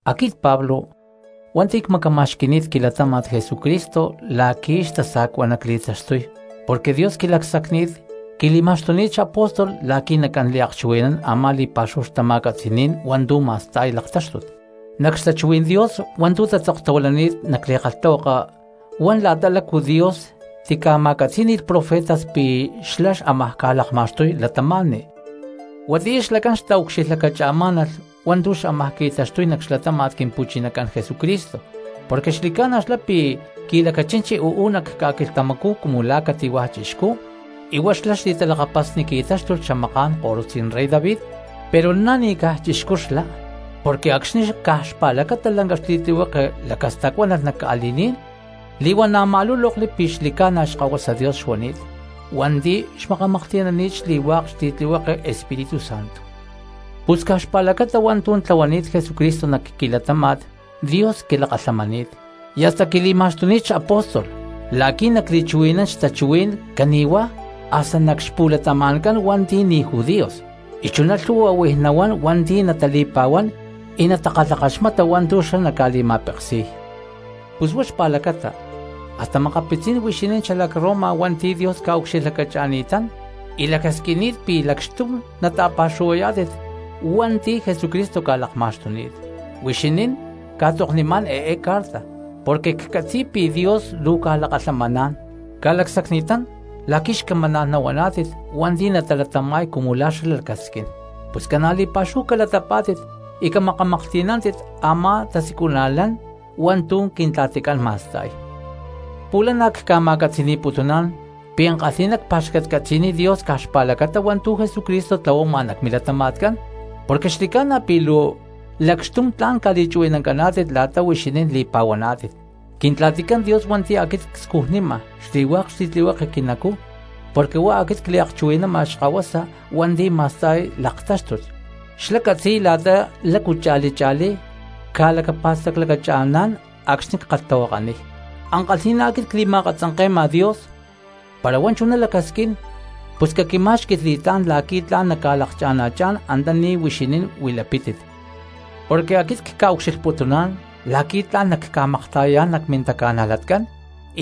Aquit Pablo hua̠nti̠ cmacama̠xqui̠ni̠t quilatáma̠t Jesucristo la̠qui̠ xtasa̠cua nacli̠taxtuy porque Dios quilacsacni̠t, quili̠ma̠xtuni̠t xapóstol la̠qui̠ nacán liakchuhui̠nán a̠má li̠pa̠xúhu xtama̠catzi̠ní̠n hua̠ntu̠ ma̠sta̠y laktáxtut. Nac xtachuhuí̠n Dios hua̠ntu̠ tatzoktahuilani̠t nac li̠kalhtahuaka huán la̠ta lácu Dios tica̠ma̠catzí̠ni̠lh profetas pi̠ xlá xámaj ca̠lakma̠xtuy cristianos. Huatiyá xlacán xtaucxilhlacachimá̠nalh hua̠ntu̠ xámaj qui̠taxtuy nac xlatáma̠t Quimpu̠chinacán Jesucristo, porque xli̠ca̠na xlá pi̠ qui̠lacachinchi uú nac ca̠quilhtamacú cumu la̠ cati̠hua̠ chixcú y huá xli̠talakapasni qui̠táxtulh xamaká̠n korutzí̠n rey David. Pero na̠ ni̠caj chixcú xlá porque acxni̠ caj xpa̠lacata lanca xli̠tlihueke lacastacuánalh nac ca̠li̠ní̠n, li̠huana̠ ma̠lúlokli pi̠ xli̠ca̠na Xkahuasa Dios xuani̠t hua̠nti̠ xmakamaklhti̠nani̠t xli̠hua̠k xli̠tlihueke Espíritu Santo. Pus caj xpa̠lacata hua̠ntu̠ tlahuani̠t Jesucristo nac quilatáma̠t Dios quilakalhamani̠t, y hasta quili̠ma̠xtuni̠t xapóstol la̠qui̠ nacli̠chuhui̠nán xtachuhuí̠n cani̠huá hasta nac xpu̠latama̠ncán hua̠nti̠ ni̠ judíos, y chuná lhu̠hua huij nahuán hua̠nti̠ natali̠pa̠huán y natakalhakaxmata hua̠ntu̠ xlá naca̠li̠ma̠peksi̠y. Pus huá xpa̠lacata hasta makapitzí̠n huixinín xalac Roma hua̠nti̠ Dios ca̠ucxilhlacacha̠ni̠tán y lacasquini̠t pi̠ lacxtum naca̠ta̠pa̠xuhuayá̠tit hua̠nti̠ Jesucristo ca̠lakma̠xtuni̠t. Luu huixinín cca̠tzoknimá̠n eé carta porque ccatzi̠y pi̠ Dios luu ca̠lakalhamaná̠n, ca̠lacsacni̠tán la̠qui̠ luu xcamaná̠n nahuaná̠tit hua̠nti̠ natalatama̠y cumu la̠ xlá lacasquín. Pus luu ca̠na̠ li̠pa̠xúhu calatapá̠tit y camaklhti̠nántit a̠má tasiculana̠lán hua̠ntu̠ Quintla̠ticán ma̠sta̠y. Pu̠lhá cca̠ma̠catzi̠ni̠putuná̠n pi̠ ankalhi̠ná cpa̠xcatcatzi̠niy Dios caj xpa̠lacata hua̠ntu̠ Jesucristo tlahuama nac milatama̠tcán, porque xli̠ca̠na pi̠ luu lacaxtum tla̠n ca̠li̠chuhui̠nancaná̠tit la̠ta huixinín li̠pa̠huaná̠tit. Quintla̠ticán Dios hua̠nti̠ aquit cscujnima xli̠hua̠k xli̠tlihueke quinacú porque huá aquit cliakchuhui̠nama Xkahuasa hua̠nti̠ másta̠y laktáxtut, xlá catzi̠y la̠ta lácu cha̠li cha̠lí cca̠lacapa̠staclacacha̠ná̠n acxni̠ ckalhtahuakaniy. Ankalhi̠ná aquit cli̠ma̠katzanke̠ma Dios, para huá chuná lacasquín pus caquimá̠xqui̠lh li̠tlá̠n la̠qui̠ tla̠n nacca̠lakana̠chá̠n antaní huixinín huilapítit. Porque aquit cca̠ucxilhputuná̠n la̠qui̠ tla̠n nacca̠makta̠yayá̠n nac mintaca̠najlatcán,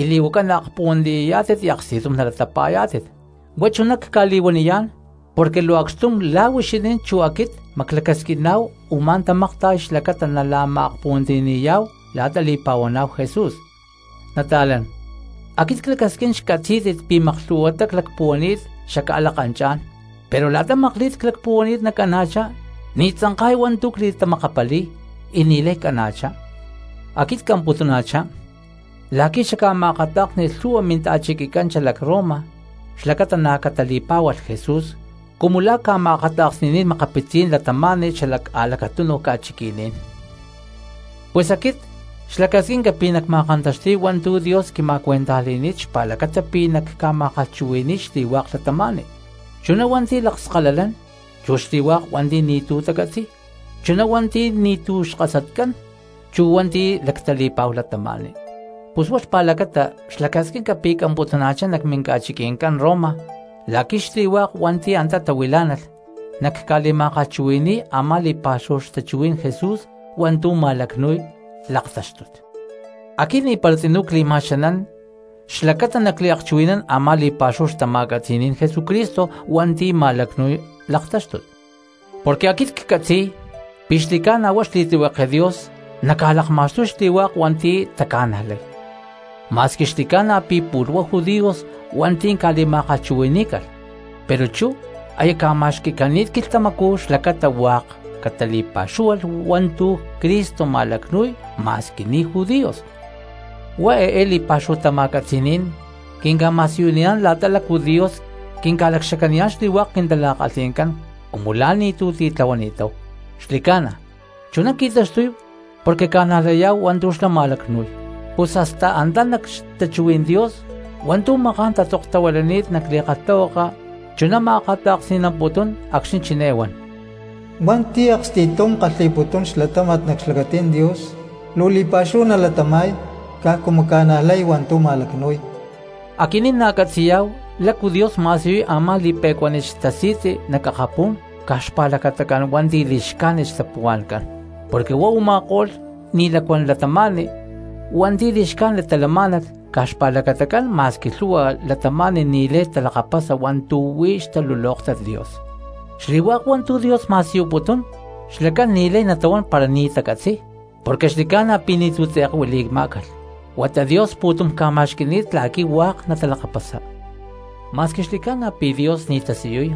y ma̠s naakpuhuantiyayá̠tit y aksti̠tum nalatapa̠yá̠tit. Huá chuná cca̠li̠huaniyá̠n porque luu acxtum la̠ huixinín chu aquit maclacasquiná̠hu u̠má tamakta̠y xlacata nala̠ma̠akpuhuantiyani̠yá̠hu la̠ta li̠pa̠huaná̠hu Jesús. Nata̠lán, aquit clacasquín xcatzí̠tit pi̠ maklhu̠huatá clacpuhuani̠t xacca̠lakanchá̠n, pero la̠ta makli̠t clacpuhuani̠t nacana̠chá ni̠ tzanka̠y hua̠ntu̠ cli̠tamakapali̠y y ni̠lay cana̠chá. Aquit camputuna̠chá la̠qui̠ xacca̠ma̠akatá̠ksni̠lh lhu̠hua mili̠ta̠chiquicán xalac Roma xlacata na̠ catali̠pá̠hualh Jesús cumu la̠ cca̠ma̠akata̠kni̠ni̠t makapitzí̠n cristianos xala a̠lacatunuj ca̠chiqui̠ní̠n. Pus aquit juerza que nacmákantaxtíy hua̠ntu̠ Dios quima̠cuentajli̠ni̠t xlacata pi̠ nacca̠ma̠kalhchuhui̠ni̠y xli̠hua̠k cristianos, chuná hua̠nti̠ lakskalalán chu xli̠hua̠k hua̠nti̠ ni̠tu̠ tacatzi̠y, chuná hua̠nti̠ ni̠tu̠ xkasatcán chu hua̠nti̠ lactali̠pa̠huá cristianos. Pus huá xpa̠lacata luu juerza cliamputuna̠chá nac minca̠chiqui̠ncán Roma la̠qui̠ xli̠hua̠k hua̠nti̠ antá tahuilá̠nalh nacca̠li̠ma̠kalhchuhui̠ni̠y a̠má li̠pa̠xúhu xtachuhuí̠n Jesús hua̠ntu̠ ma̠lacnu̠y laktáxtut. Aquit ni̠para tzinú cli̠ma̠xanán xlacata nacliakchuhui̠nán a̠má li̠pa̠xúhu xtama̠catzi̠ní̠n Jesucristo hua̠ntu̠ ma̠lacnu̠y laktáxtut, porque aquit ccatzi̠y pi̠ xli̠ca̠na huá xli̠tlihueke Dios naca̠lakma̠xtuy xli̠hua̠k hua̠nti̠ taca̠najlay. Ma̠squi xli̠ca̠na pi̠ pu̠lh huá judíos hua̠nti̠ ca̠li̠ma̠kalhchuhui̠ní̠calh, pero chú aya ca̠ma̠xqui̠cani̠t quilhtamacú xlacata hua̠k catali̠pa̠xúhualh hua̠ntu̠ Cristo ma̠lacnu̠y ma̠squi ni̠ judíos. Huá eé li̠pa̠xúhu tama̠catzi̠ní̠n quinca̠ma̠siyuniyá̠n la̠ta lácu Dios quinca̠lacxacaniyá̠n xli̠hua̠k quintala̠kalhi̠ncán cumu la̠ ni̠tu̠ titlahuani̠táhu; xli̠ca̠na, chuná qui̠taxtuy porque ca̠najlayá̠hu hua̠ntu̠ xlá ma̠lacnu̠y. Pus hasta antá nac xtachuhuí̠n Dios hua̠ntu̠ maká̠n tatzoktahuilani̠t nac li̠kalhtahuaka chuná ma̠akata̠ksni̠namputún acxni̠ chiné huan: “Hua̠nti̠ aksti̠tum kalhi̠putún xlatáma̠t nac xlacatí̠n Dios, luu li̠pa̠xúhu nalatama̠y caj cumu ca̠najlay hua̠ntu̠ ma̠lacnu̠y.” Aquinín na̠ catzi̠yá̠hu lácu Dios ma̠siyuy a̠má li̠pe̠cuánit xtasi̠tzi nac akapú̠n caj xpa̠lacatacán hua̠nti̠ lacli̠xcájnit xtapuhua̠ncán, porque huá u̠ma̠ko̠lh ni̠ lacuán cristianos hua̠nti̠ li̠xcájnit talamá̠nalh caj xpa̠lacatacán ma̠squi lhu̠hua cristianos ni̠lay talakapasa hua̠ntu̠ huí xtalulóktat Dios. Xli̠hua̠k hua̠ntu̠ Dios ma̠siyuputún, xlacán ni̠lay natahuán para ni̠ tacatzi̠y, porque xli̠ca̠na pi̠ ni̠tu̠ tze̠k huili̠má̠calh huata Dios pu̠tum ca̠ma̠xqui̠ni̠t la̠qui̠ hua̠k natalakapasa. Ma̠squi xli̠ca̠na pi̠ Dios ni̠ tasiyuy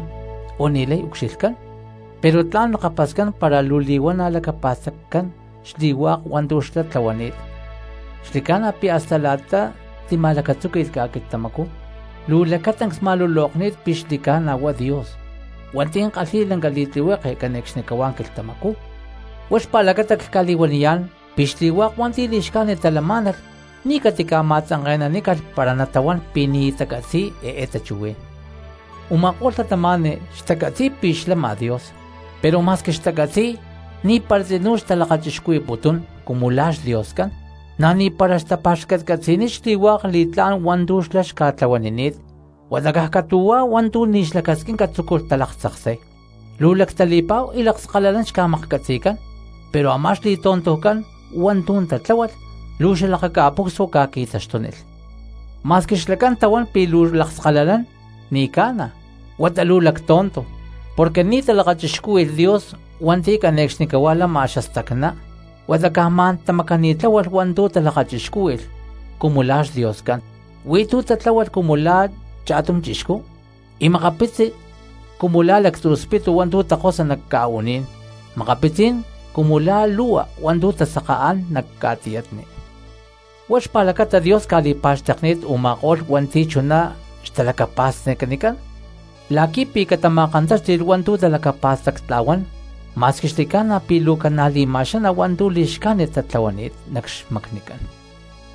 o ni̠lay ucxilhcán, pero tla̠n lakapascán para luu li̠huana̠ lacapa̠staccán xli̠hua̠k hua̠ntu̠ xlá tlahuani̠t. Xli̠ca̠na pi̠ hasta la̠ta tima̠lacatzúqui̠lh ca̠quilhtamacú luu lacatancs ma̠lulokni̠t pi̠ xli̠ca̠na huá Dios hua̠nti̠ kalhi̠y lanca li̠tlihueke cane̠cxnicahuá quilhtamacú. Huá xpa̠lacata cca̠li̠huaniyá̠n pi̠ xli̠hua̠k hua̠nti̠ li̠xcájnit talamá̠nalh ni̠ catica̠ma̠tzanke̠nanícalh para natahuán pi̠ ni̠ xtacatzi̠y eé tachuhuí̠n. Uma̠kó̠lh cristianos xtacatzi̠y pi̠ xlama Dios, pero ma̠squi xtacatzi̠y ni̠para tzinú xtalakachicuhui̠putún cumu la̠ xDioscán, na̠ ni̠para xtapa̠xcatcatzi̠niy xli̠hua̠k li̠tlá̠n hua̠ntu̠ xlá xca̠tlahuanini̠t, huata caj catu̠huá hua̠ntu̠ ni̠ xlacasquinca tzúculh talaktzaksay. Luu lactali̠pa̠hu y lakskalalán xca̠maklhcatzi̠cán, pero a̠má xli̠tontujcán hua̠ntu̠ tatláhualh luu xalakaca̠pucsua ca̠qui̠taxtúnilh. Ma̠squi xlacán tahuán pi̠ luu lakskalalán, ni̠ ca̠na huata caj luu xalactonto, porque ni̠ talakachixcúhui̠lh Dios hua̠nti̠ cane̠cxnicahuá lama xastacná, huata caj ma̠n tamacani̠tláhualh hua̠ntu̠ talakachixcúhui̠lh cumu la̠ xdioscán. Huí tu̠ tatláhualh cumu la̠ cha̠tum chixcú, y makapitzí̠n cumu la̠ lactzu̠ spitu hua̠ntu̠ takosa nac ca̠u̠ní̠n, makapitzí̠n cumu la̠ lu̠hua hua̠ntu̠ tasakaán nac ca̠tiyatni. Huá xpa̠lacata Dios ca̠li̠pa̠xtekni̠t u̠ma̠ko̠lh hua̠nti̠ chuná xtalacapa̠stacnicán la̠qui̠pi̠ catama̠kantáxti̠lh hua̠ntu̠ talacapa̠stactla̠huán, ma̠squi xli̠ca̠na pi̠ luu ca̠na̠ li̠ma̠xaná hua̠ntu̠ li̠xcájnit la̠tlahuaniy nac xmacnicán.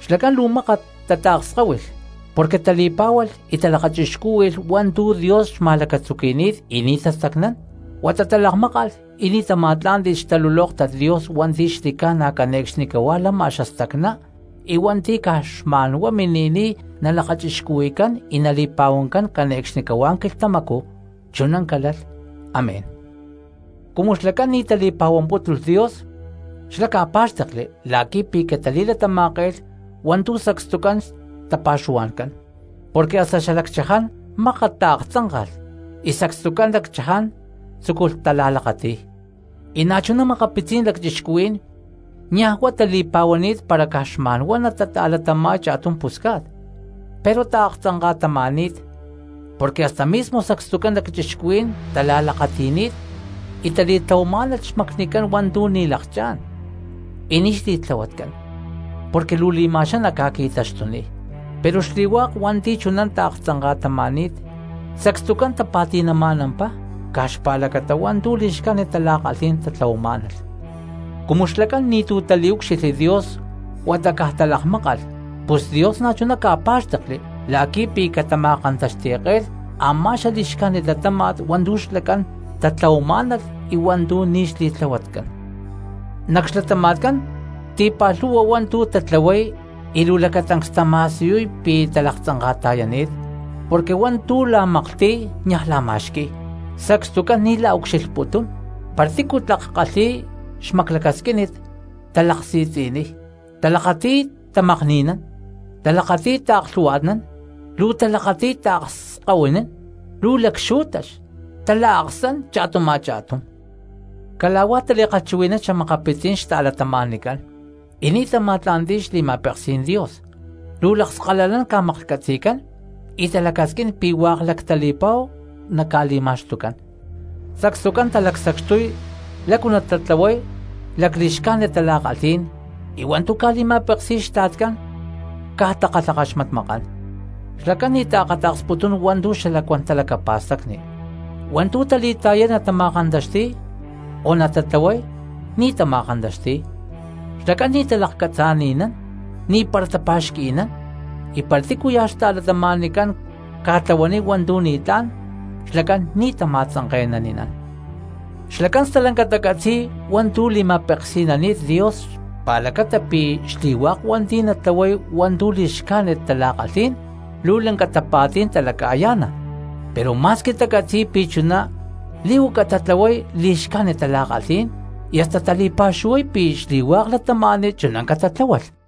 Xlacán luu mákat tataakskáhuilh porque tali̠pá̠hualh y talakachixcúhui̠lh hua̠ntu̠ Dios xca̠ma̠lacatzuqui̠ni̠t y ni̠ tastacnán, huata talakmákalh y ni̠ tama̠tlá̠nti̠lh xtalulóktat Dios hua̠nti̠ xli̠ca̠na cane̠cxnicahuá lama xastacná y hua̠nti̠ caj xma̠nhuá mini̠niy nalakachixcuhui̠cán y nali̠pa̠huancán cane̠cxnicahuá quilhtamacú. Chuná calálh, amén. Cumu xlacán ni̠ tali̠pa̠huampútulh Dios xlá ca̠pá̠xtekli la̠qui̠pi̠ catali̠latama̠ke̠lh hua̠ntu̠ sacstucán xtapa̠xuhua̠ncán, porque hasta xalacchaján mákat taaktzánka̠lh y sacstucán lacchaján tzúculh tala̠lakati̠y. Y na̠ chuná makapitzí̠n lacchixcuhuí̠n niaj huá tali̠pa̠huani̠t para caj xma̠nhuá natata̠latama̠y cha̠tum pusca̠t, pero taaktzanka̠tama̠ni̠t porque hasta mismo sacstucán lacchixcuhuí̠n tala̠lakati̠ni̠t y tali̠tlahuamá̠nalh xmacnicán hua̠ntu̠ ni̠ lakchá̠n y ni̠ xli̠tlahuatcán porque luu li̠ma̠xaná ca̠qui̠taxtuniy. Pero xli̠hua̠k hua̠nti̠ chuná taaktzanka̠tama̠ni̠t sacstucán tapa̠ti̠nama̠nampá caj xpa̠lacata hua̠ntu̠ li̠xcájnit tala̠kalhí̠n tatlahuamá̠nalh. Cumu xlacán ni̠tu̠ taliúcxilhli Dios huata caj talakmákalh pus Dios na̠chuná ca̠pá̠xtekli la̠qui̠ pi̠ catama̠kantaxti̠ke̠lh a̠má xali̠xcájnit latáma̠t hua̠ntu̠ xlacán tatlahuamá̠nalh y hua̠ntu̠ ni̠ xli̠tlahuatcán. Nac xlatama̠tcán ti̠pa̠lhu̠hua hua̠ntu̠ tatlahuay y luu lacatancs tama̠siyuy pi̠ talaktzanka̠ta̠yani̠t, porque hua̠ntu̠ la̠maklhti̠y niaj la̠ma̠xqui̠y, sacstucán ni̠ la̠ucxilhputún, para tícu tlak lhu̠hua kalhi̠y xmaclacasquínit talaksi̠tzi̠niy, talakati̠y tamakni̠nán, talakati̠y taaklhu̠hua̠tnán, luu talakati̠y taakskahuinán, luu lacxú̠tax, tala̠aksán cha̠tum a̠cha̠tum. Cala̠huá tali̠kalhchuhui̠nán xa̠makapitzí̠n cristianos, y ni̠ tama̠tla̠nti̠y xli̠ma̠peksí̠n Dios, luu lakskakalán ca̠maklhcatzi̠cán y talacasquín pi̠ hua̠k lactali̠pa̠hu naca̠li̠ma̠xtucán, sacstucán talacsacxtuy lácu natatlahuay lacli̠xcájnit tala̠kalhí̠n y hua̠ntú ca̠li̠ma̠peksi̠y xtla̠tcán caj takalhakaxmatmakán. Xlacán ni̠ taakata̠ksputún hua̠ntu̠ xalacuán talacapa̠stacni, hua̠ntu̠ tali̠ta̠yay natama̠kantaxti̠y o natatlahuay ni̠ tama̠kantaxti̠y, xlacán ni̠ talakcatzani̠nán, ni̠para tapa̠xqui̠nán, y para tícuya̠ cristiano ca̠tlahuaniy hua̠ntu̠ ni̠tlá̠n xlacán ni̠ tama̠tzanke̠nani̠nán. Xlacán stalanca tacatzi̠y hua̠ntu̠ li̠ma̠peksi̠nani̠t Dios xlacata pi̠ xli̠hua̠k hua̠nti̠ natatlahuay hua̠ntu̠ li̠xcájnit tala̠kalhí̠n luu lanca tapa̠tí̠n talacayá̠na; pero ma̠squi tacatzi̠y pi̠ chuná li̠huaca tatlahuay li̠xcájnit tala̠kalhí̠n y hasta tali̠pa̠xuhuay pi̠ xli̠hua̠k cristianos chuná catatláhualh.